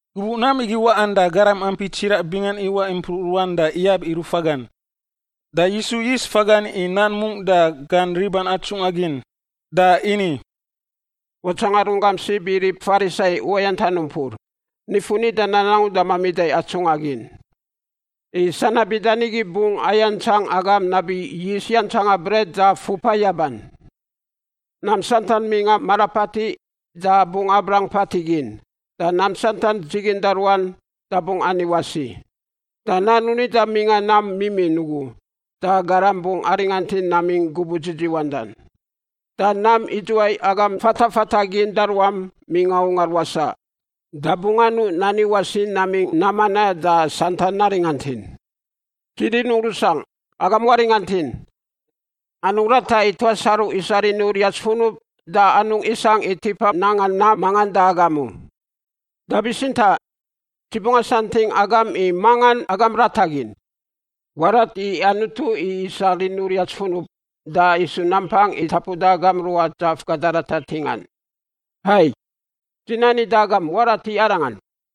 Gubuꞌ nam igi waꞌan da garam ampi tsiraꞌ bingan iwaꞌ impruꞌ ruan da iyab i rufagan. Da Yisu yis fagan i nan mungꞌ da gan riban atsungꞌa gin, da ini, “Watsanga runggam sib i rib Farisai uwayantan umpur, nifun nidan angu da mamida i atsungꞌa gin. I sanab bida nigi bungꞌ ayantsang agam nabi yist yantsanga bret da fupa yaban. Nam santan mingꞌa mara patiꞌ da bungꞌ abrang patiꞌ gin, da nam santan dziginda ruan da bungꞌ ani wasi. Da nan u nida mingꞌa nam mimin ugu da garam bungꞌ aringantin namingꞌ gubuꞌ dzidziwandan. Da nam idzuwai agam fatafata gin da ruam mingꞌa ungar wasaꞌ da bungꞌ anuꞌ nani wasi namingꞌ nam manaꞌ da santan naringantin. “Dzi rinungꞌ rusangꞌ, agam waringantin. Anungꞌ rata i tuas aru isa rini uriats funub da anungꞌ isangꞌ i tipa nanga nam mangan da agam u. Da bitsintaꞌ, dzi bungꞌ asanting agam i mangan agam rata gin. Warat i Anutu i isa rini uriats funub da isu nampang i tapuda agam ruꞌa dzaf gada ratar ntingan. Hai, dzi nani da agam warat i Arangan.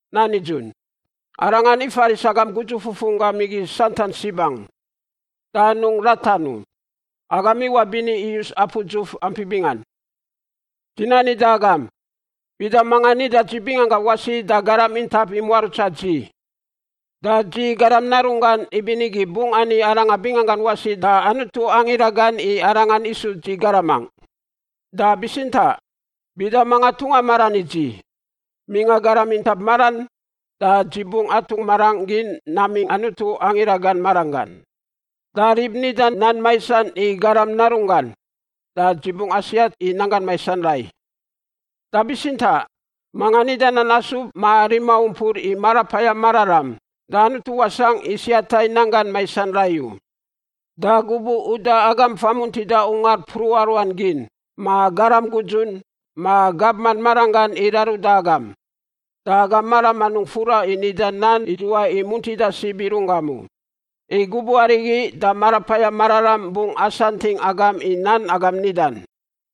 Nan nidzun, Arangan ifaris agam gudzu fufunggam igi santan sib angu. Da anungꞌ ratan u; agam iwaꞌ bini iyus apu dzuf ampi bingan. “Dzi nani da agam, bida manga nida dzi binganggangꞌ wasi da garam intap i muarutsa dzi, da dzi, Garam Narunggan, ibinigi bungꞌ ani arangan binganggan wasi da Anutu angira gan i arangan isu dzi garamangꞌ. Da bitsintaꞌ, bida manga tungꞌa maran i dzi mingꞌa garam intap maran da dzi bungꞌ atungꞌ marangꞌ gin namingꞌ Anutu angira gan maranggan. Da rib nida nan maisan i Garam Narunggan da dzi bungꞌ asiat i nanggan maisan rai, da bitsintaꞌ, mangan nida nan asub ma rima umpur i Marapayam Mararam da Anutu wasangꞌ i siata i nanggan maisan rai u. “Da gubuꞌ uda agam famuntida ungar mpruꞌa ruan gin, ma garam gudzun, ma gabman maranggan i raruda agam, da agam maram anungꞌ fura i nida nan idzuwai i muntida sib i runggam u. I gubuꞌ arigi da Marapayam Mararam bungꞌ asanting agam i nan agam nidan.”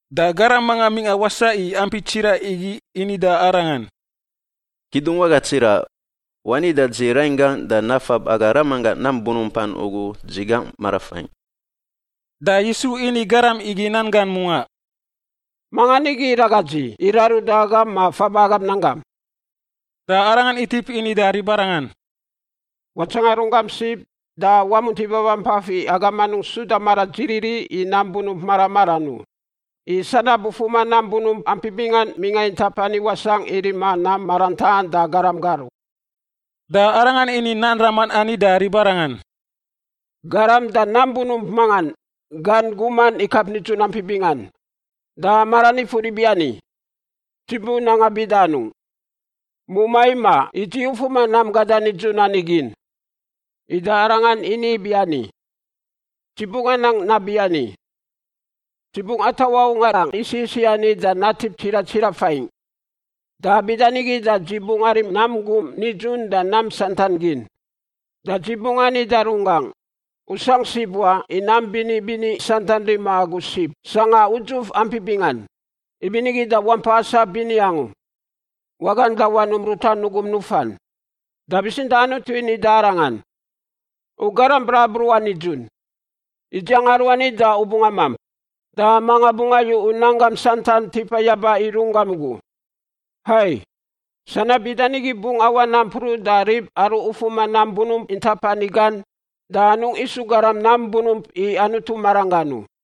Da garam manga mingꞌa wasaꞌ i ampi tsiraꞌ igi ini da Arangan, “Kidungwaga tsiraꞌ, wani da dzi rainggaꞌ da nafab aga ramanggaꞌ nam bunumpan ugu dzi gangꞌ marafaingꞌ.” Da Yisu ini garam igi nan gan mungaꞌ, “Mangan igi iraga dzi i raruda agam ma faba agam nanggam?” Da Arangan itip ini da ribarangan, “Watsanga runggam sib da wamunti babampaf i agam anungꞌ suda mara dziriri i nam bunump mara maran u. I sanab ufuma nam bunump ampi bingan mingꞌa intap ani wasangꞌ i rima nam maran taꞌan da garam gar u.” Da Arangan ini nan raman ani da ribarangan: “Garam da nam bunump mangan gan guman ikap nidzun ampi bingan. Da maran ifur ibiani, ‘Dzi bu nanga bida anungꞌ? Mumai imaꞌ i dzi ufuma nam gadan nidzun ani gin.’ Ida arangan ini ibiani, ‘Dzi bungꞌ anang nabiani. Dzi bungꞌ atawaꞌ ungarangꞌ isiꞌ isiꞌ ani da natip tsiraꞌ tsiraꞌ faingꞌ, da bida nigi da dzi bungꞌ arim nam gum nidzun da nam santan gin. Da dzi bungꞌ ani da runggangꞌ, “U sangꞌ sib wa i nam bini bini santan rima agu sib sangꞌa udzuf ampi bingan. Ibinigi da wampa asap bini angu, wagan, da wanum ruta nugum nufan.”’ Da bitsintaꞌ Anutu ini da arangan, ‘U garam brabruꞌan nidzun! Idziang aruani da u bungꞌ amamp. Da manga bungꞌ ayu u nanggam santan tipa yaba i runggam ugu?’ Hai. Sanab bida nigi bungꞌ awaꞌ nampruꞌ da rib aru ufuma nam bunump intap ani gan, da anungꞌ isu garam nam bunump i Anutu maranggan u.”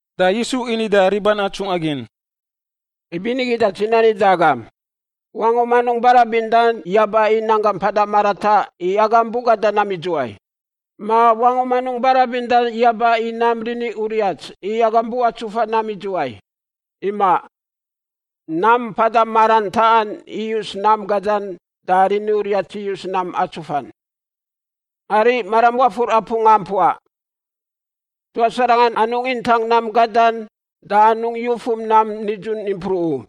Da Yisu ini da riban atsungꞌa gin, “Ibinigi da dzi ni da agam, wangum anungꞌ barabindan yaba i nanggam mpada marataꞌ i agam bu gada nam idzuwai, ma wangum anungꞌ barabindan yaba i nam rini uriats i agam bu atsufa nam idzuwai. Imaꞌ. Nam mpada maran taꞌan iyus nam gadan da rini uriats iyus nam atsufan. “Ariꞌ maram wafur apu ngampuaꞌ: Tuas aranga anungꞌ intang nam gadan da anungꞌ yufum nam nidzun impruꞌ u,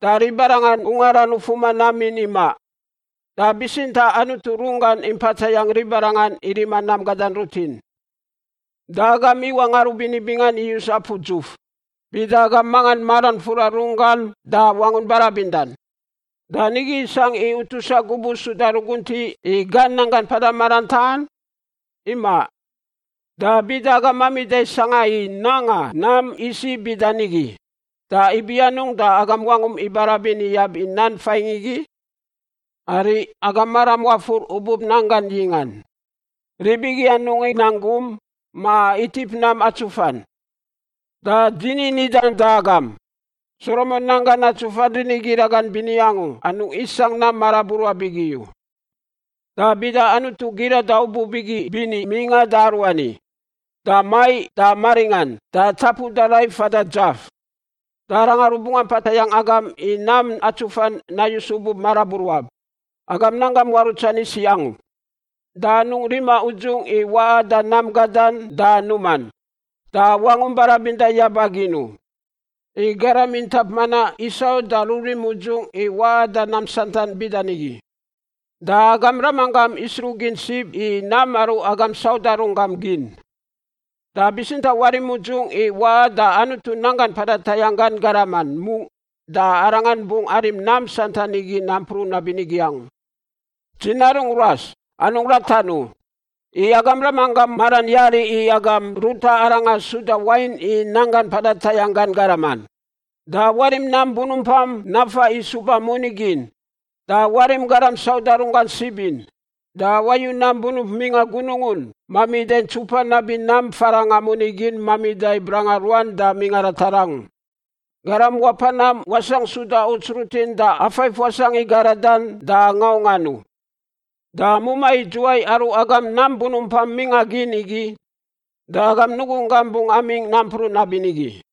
da ribarangan ungaran ufuma nam in imaꞌ. Da bitsintaꞌ Anutu runggan impa tayangꞌ ribarangan i rima nam gadan rutin. Da agam iwaꞌ ngarubini bingan iyus apu dzuf. Bida agam mangan maran fura runggan da wangun barabindan, da nigi isangꞌ i utusa gubuꞌ suda ruguntiꞌ i gan nanggan mpada maran taꞌan? Imaꞌ. Da bida agam mamida sangꞌa i nanga nam isiꞌ bida nigi, da ibi anungꞌ da agam wangum ibarabin iyab i nam faingꞌ igi? “Ariꞌ, agam maram wafur ubub nanggan yingꞌan. Rib igi anungꞌ inang gum ma itip nam atsufan. Da dzi ni nidan da agam, Solomon nanggan atsufan rini gira gan bini angu anungꞌ isangꞌ nam maraburuab igi u. Da bida Anutu girada ubub igi bini mingꞌan da aruani, da maiꞌ da maringꞌan da tapuda rai fada dzaf, da Arangan rubungꞌ ampa tayangꞌ agam i nam atsufan nayus ubub maraburuab. Agam nanggam muarutsan isiꞌ angu! “Da anungꞌ rima udzungꞌ i waꞌa da nam gadan da numan, da wangum barabinda yaba gin u. I garam intap manaꞌ isau da rurim udzungꞌ i waꞌa da nam santan bida nigi, da agam Ramanggam isruꞌgin sib i nam aru agam sauda runggam gin. Da bitsintaꞌ warim udzungꞌ i waꞌa da Anutu nanggan mpada tayangꞌ gan garaman mungꞌ da Arangan bungꞌ arim nam santan igi nampruꞌ nabinigi angu. “Dzi narungꞌ ruas, anungꞌ ratan u. I agam Ramanggam maran yari i agam ruta Arangan suda wain i nanggan mpada tayangꞌ gan garaman. Da warim nam bunumpam nafa i suba moni gin, da warim garam sauda runggan sib in. Da wayu nam bunump mingꞌa Gunungun mamida i ntsupan nabi nam farangꞌa moni gin mamida i branga ruan da mingꞌa ratar angu. Garam wapa nam wasangꞌ suda uts rutin da afaif wasangꞌ i garadan da ngaungꞌan u. Da mumai idzuwai aru agam nam bunumpam mingꞌa gin igi da agam nugunggam bungꞌ amingꞌ nampruꞌ nabinigi.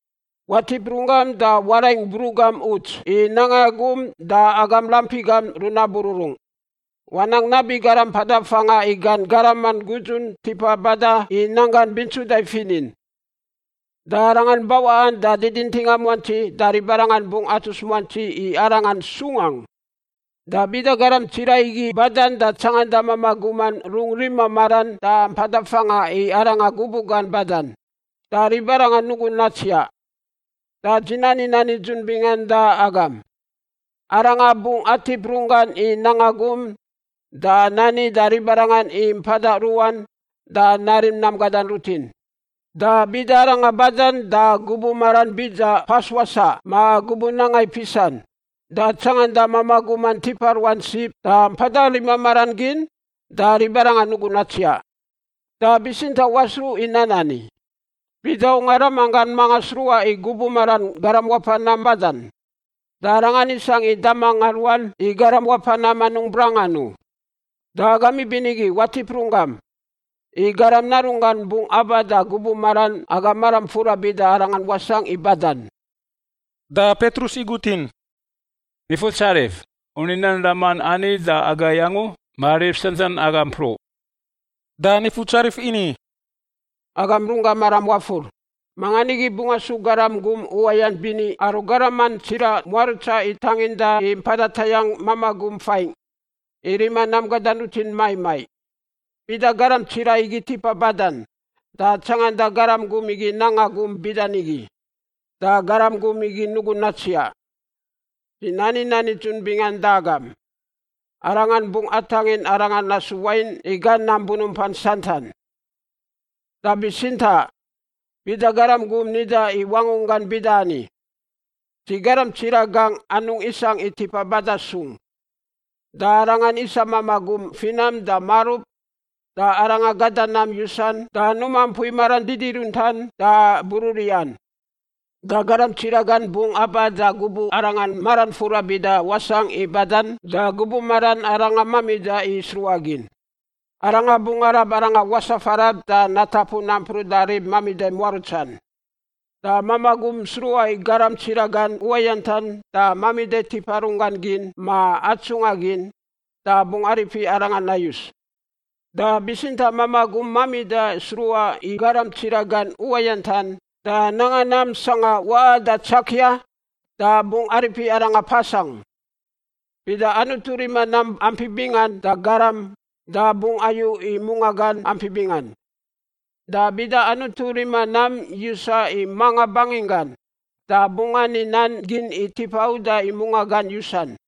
“Watip runggam da waraing bruꞌ gam uts i nanga gum da agam rampi gam runabururung. Wanang nabi garam mpada fangꞌa i gan garaman gudzun tipa bada i nanggan bintsuda i finin. Da arangan bawaꞌan da didintinga muantsi da ribarangan bungꞌ atus muantsi i arangan sung angu. Da bida garam tsiraꞌ igi badan da tsanganda mamaꞌ guman rungꞌ rima maran da mpada fangꞌa i arangan gubuꞌ gan badan, da ribarangan nugun natsiaꞌ. Da dzi nani nan nidzun bingan da agam; arangan bungꞌ atip runggan i nanga gum da nani da ribarangan i mpada ruꞌan da narim nam gadan rutin. Da bida arangan badan da gubuꞌ maran bida pas wasaꞌ ma gubuꞌ nanga i pisan, da tsanganda mamaꞌ guman tipa ruan sib da mpada rima maran gin, da ribarangan nugun natsiaꞌ. Da bitsintaꞌ wasruꞌ i nan ani. Bida ungar ramanggan mangan sruꞌa i gubuꞌ maran garam wapa nam badan, da arangan isangꞌ i damangꞌa ruan i garam wapa nam anungꞌ brangan u. Da agam ibinigi watip runggam! I Garam Narunggan bungꞌ aba da gubuꞌ maran agam maram fura bida arangan wasangꞌ i badan.” Da Petrus igutin, “Nifutsarif, u ni nan raman ani da agai angu ma rib santan aga mpruꞌ?” Da Nifutsarif ini, “Agam runggam maram wafur. Mangan igi bungꞌ asu garam gum uwayant bini aru garaman tsiraꞌ muarutsan i tanginda i mpada tayangꞌ mamaꞌ gum faingꞌ, i rima nam gadan rutin maiꞌ maiꞌ? Bida garam tsiraꞌ igi tipa badan da tsanganda garam gum igi nanga gum bida nigi, da garam gum igi nugun natsiaꞌ. Dzi nani nan nidzun bingan da agam, arangan bungꞌ atangin arangan nasu wain i gan nam bunumpan santan. Da bitsintaꞌ bida garam gum nida i wangunggan bida ani, ‘Dzi garam tsiraꞌ gangꞌ anungꞌ isangꞌ i tipa bada sung,’ da arangan isa mamaꞌ gum finam da marub da arangan gada nam yusan da numa mpui maran didiruntan da bururiꞌan, da garam tsiraꞌ gan bungꞌ aba da gubuꞌ arangan maran fura bida wasangꞌ i badan da gubuꞌ maran arangan mamida i sruꞌagin. Arangan bungꞌ arab arangan wasaꞌ farab da natapu nampruꞌ da rib mamida muarutsan. “Da mamaꞌ gum sruꞌa i garam tsiraꞌ gan uwayantan da mamida tipa runggan gin ma atsungꞌa gin, da bungꞌ aripi arangan nayus. Da bitsintaꞌ mamaꞌ gum mamida sruꞌa i garam tsiraꞌ gan uwayantan da nanga nam sangꞌa waꞌan da tsakia, da bungꞌ aripi arangan pas angu. Bida Anutu rima nam ampi bingan da garam, da bungꞌ ayu i mungaꞌ gan ampi bingan; da bida Anutu rima nam yusan i manga banginggan, da bungꞌ ani nan gin i tipa uda i mungaꞌ gan yusan.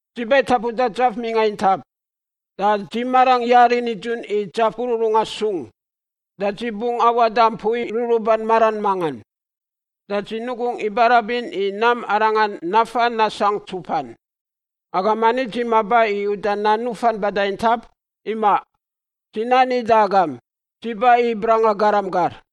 “Dzi ba i tapuda dzaf mingꞌa intap, da dzi marangꞌ yari nidzun i dzaf bururungꞌa sung. Da dzi bungꞌ awaꞌ da mpui ruruban maran mangan, da dzi nugungꞌ ibarabin i nam arangan nafa nasangꞌ ntsupan. Agam mani dzi maba i uda nan nufan bada intap? Imaꞌ! Dzi nani da agam, dzi ba i branga garam gar.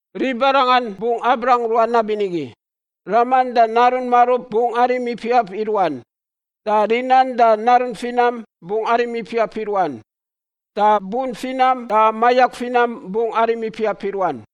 Ribarangan bungꞌ abrang ruan nabinigi: raman da narun marub bungꞌ arim ipiap i ruan, da rinan da narun finam bungꞌ arim ipiap i ruan, da bun finam da mayak finam bungꞌ arim ipiap i ruan.”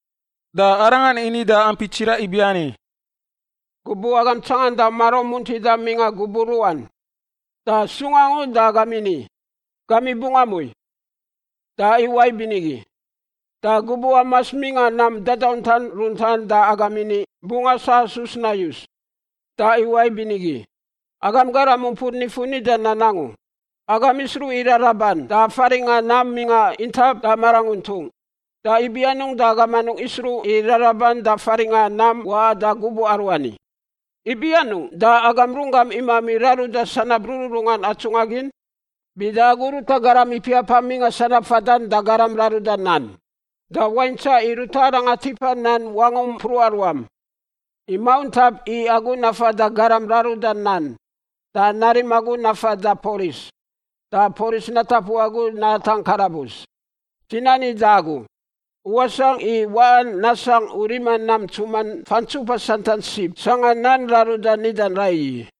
Da Arangan ini da ampi tsiraꞌ ibiani, “Gubuꞌ agam tsanganda maraum muntidan mingꞌa gubuꞌ ruꞌan, da sung angu da agam ini, ‘Gamiꞌ bungꞌ amui,’ da iwaꞌ ibinigi. Da gubuꞌ amas mingꞌa nam dadauntan runtan da agam ini, ‘Bungꞌ asasus nayus,’ da iwaꞌ ibinigi. Agam garam umpur nifun nida nan angu! Agam isruꞌ i raraban da faringꞌa nam mingꞌa intap da maranguntung. Da ibi anungꞌ da agam anungꞌ isruꞌ i raraban da faringꞌa nam waꞌan da gubuꞌ aruani? Ibi anungꞌ da agam runggam imami raruda sanab rururungan atsungꞌa gin? Bida agu ruta garam ipiapam mingꞌa sanab fadan da garam raruda nan, da waintsaꞌ i ruta arangan tipa nan wangum mpruꞌa ruam. I mauntap i agu nafa da garam raruda nan da narim agu nafa da polis da polis natapu agu natangꞌ karabus. Dzi nani da agu, u wasangꞌ i waꞌan nasangꞌ u rima nam ntsuman fantsupa santan sib sangꞌa nan raruda nidan raiyi.”